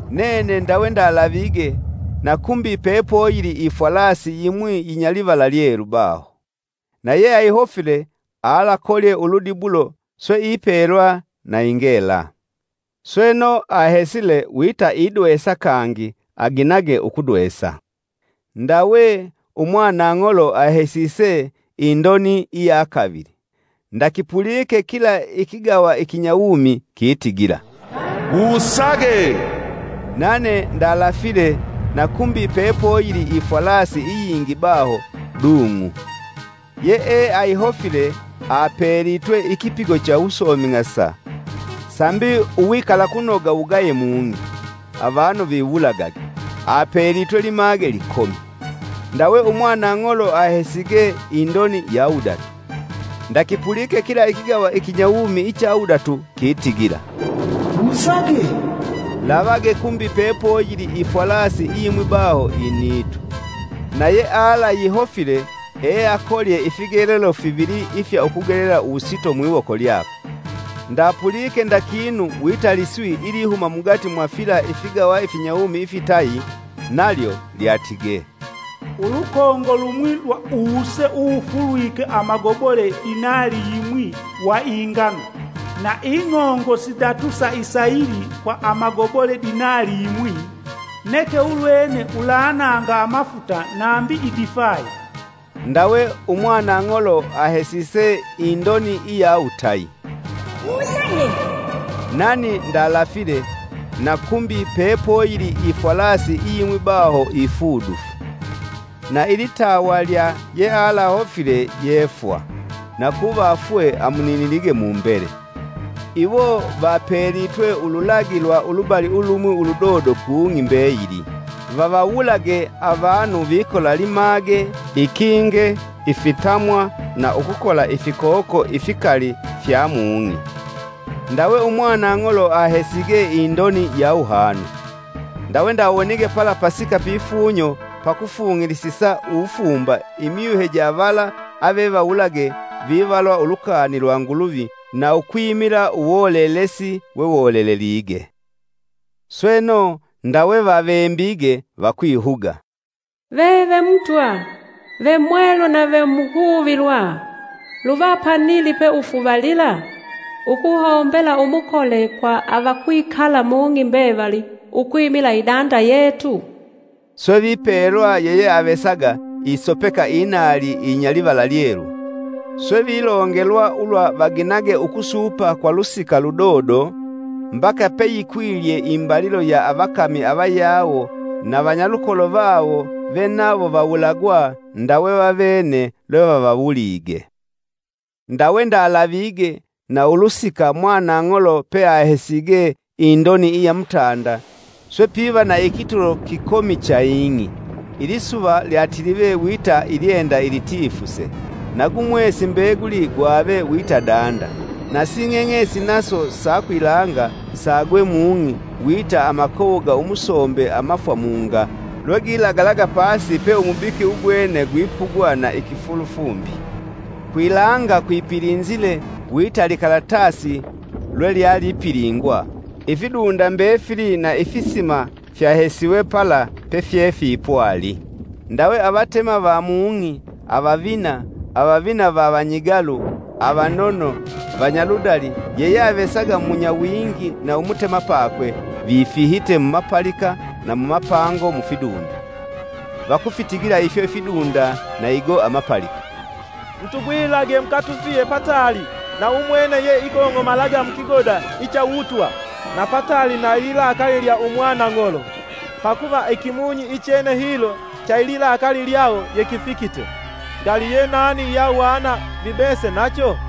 Nene ndawe ndalavige, na kumbi pepoyili ifwalasi yimwi yinya livala lyelu baho. Na yeayihofile alakolye uludibulo, swe ipelwa na ingela. Sweno, ahesile wita idwesa kangi aginage ukudwesa. Ndawe, umwanang'olo ahesise indoni iya kavili. Ndakipulike kila ikigawa ikinyawumi kitigila, “Wusage!” Nane ndalafile na kumbi pepoyili ifwalasi iyingi baho, dung'u. Yeeayihofile apelitwe ikipigo cha uwusoming'asa sambi uwikalakunoga wugaye mung'i, avanu viwulagage, apelitwe limage likomi. Ndawe umwanang'olo ahesige indoni ya wudatu. Ndakipulike kila ikigawa ikinyawumi icha wudatu kitigila, “Wusage!” Lavage kumbi pepoyili ifwalasi iyimwi baho initu. Na yealayihofile eakolye ifigelelo fivili ifya ukugelela uwusito mwiwoko lyakwe. Ndapulike nda kinu wita liswi ilihuma mugati mwa fila ifigawa ifinyawumi ifitayi, nalyo lyatige, “Ulukongo lumwi lwa uwuse uwufulwike amagobole dinali yimwi wa ingano, na ing'ongo sidatu sa isayili kwa amagobole dinali yimwi, neke ulwene ulananga amafuta nambi idifayi!” Ndawe umwanang'olo ahesise indoni iya wutayi. “Wusage!” Nani ndalafile, na kumbi pepoyili ifwalasi iyimwi baho ifudufu. Nailitawa lya yealahofile yee fwa, na kuvafwe amuninilige mumbele. Iwo vapelitwe ululagi lwa ulubali ulumwi uludodo ku ng'i, mbeyili, vavawulage avanu vikola limage, ikinge, ifitamwa na ukukola ifikoko ifikali fya mung'i. Ndawe Umwanang'olo ahesige indoni ya wuhanu. Ndawe ndawonige pala pasika pifunyo pakufung'ilisisa uwufumba imyuhe ja vala avevawulage vivalwa ulukani lwa Nguluvi, na ukwimila uwolelesi wewolelelige. Sweno, ndawe vavembige vakwihuga: “Veve Mutwa, ve Mwelu na ve muhuvilwa, luva panili peufuvalila ukuhombela umukole kwa avakwikala mung'i mbevali ukwimila idanda yetu?” Swe vipelwa yeyeavesaga isopeka inaali iyinya livala lyelu, swe vilongelwa ulwa vaginage ukusupa kwa lusika ludodo, mbaka peyikwilye imbalilo ya avakami avayawo na vanyalukolo vawo ve nawo vawulagwa ndawe vavene lwevavawulige. Ndawe ndalavige, na ulusika umwanang'olo peahesige indoni iya mutanda, swe piva na ikitulo kikomi cha ing'i; ilisuva lyatilive wita ilyenda ilitifuse; na gu mwesi mbeguli gwave wita danda; nasi ng'eng'esi naso sa kwilanga saagwe mung'i wita amakowo ga umusombe amafwamunga lwegilagalaga pasi pe umubiki ugwene gwipuga na ikifulufumbi. Kwilanga kwipilinzile wita likalatasi lwelyalipilingwa; ifidunda mbefili na ifisima fyahesiwe pala pefyefipwali. Ndawe avatema va mung'i, avavina, avavina va vanyigalu, avanono, vanyaludali, yeyeavesaga munyawingi na umutemapakwe, vifihite mumapalika na mumapango mufidunda. Vakufitigila ifyo ifidunda na igo amapalika, “Mutugwilage, mukatufihe pataali na umwene ye ikong'omalaga mukigoda icha uwutwa, na pataali na ililakali lya Umwanang'olo! Pakuva ikimunyi ichene hilo cha ililakali lyawo yekifikite. Ngali yenani yeahwana vibese nacho?”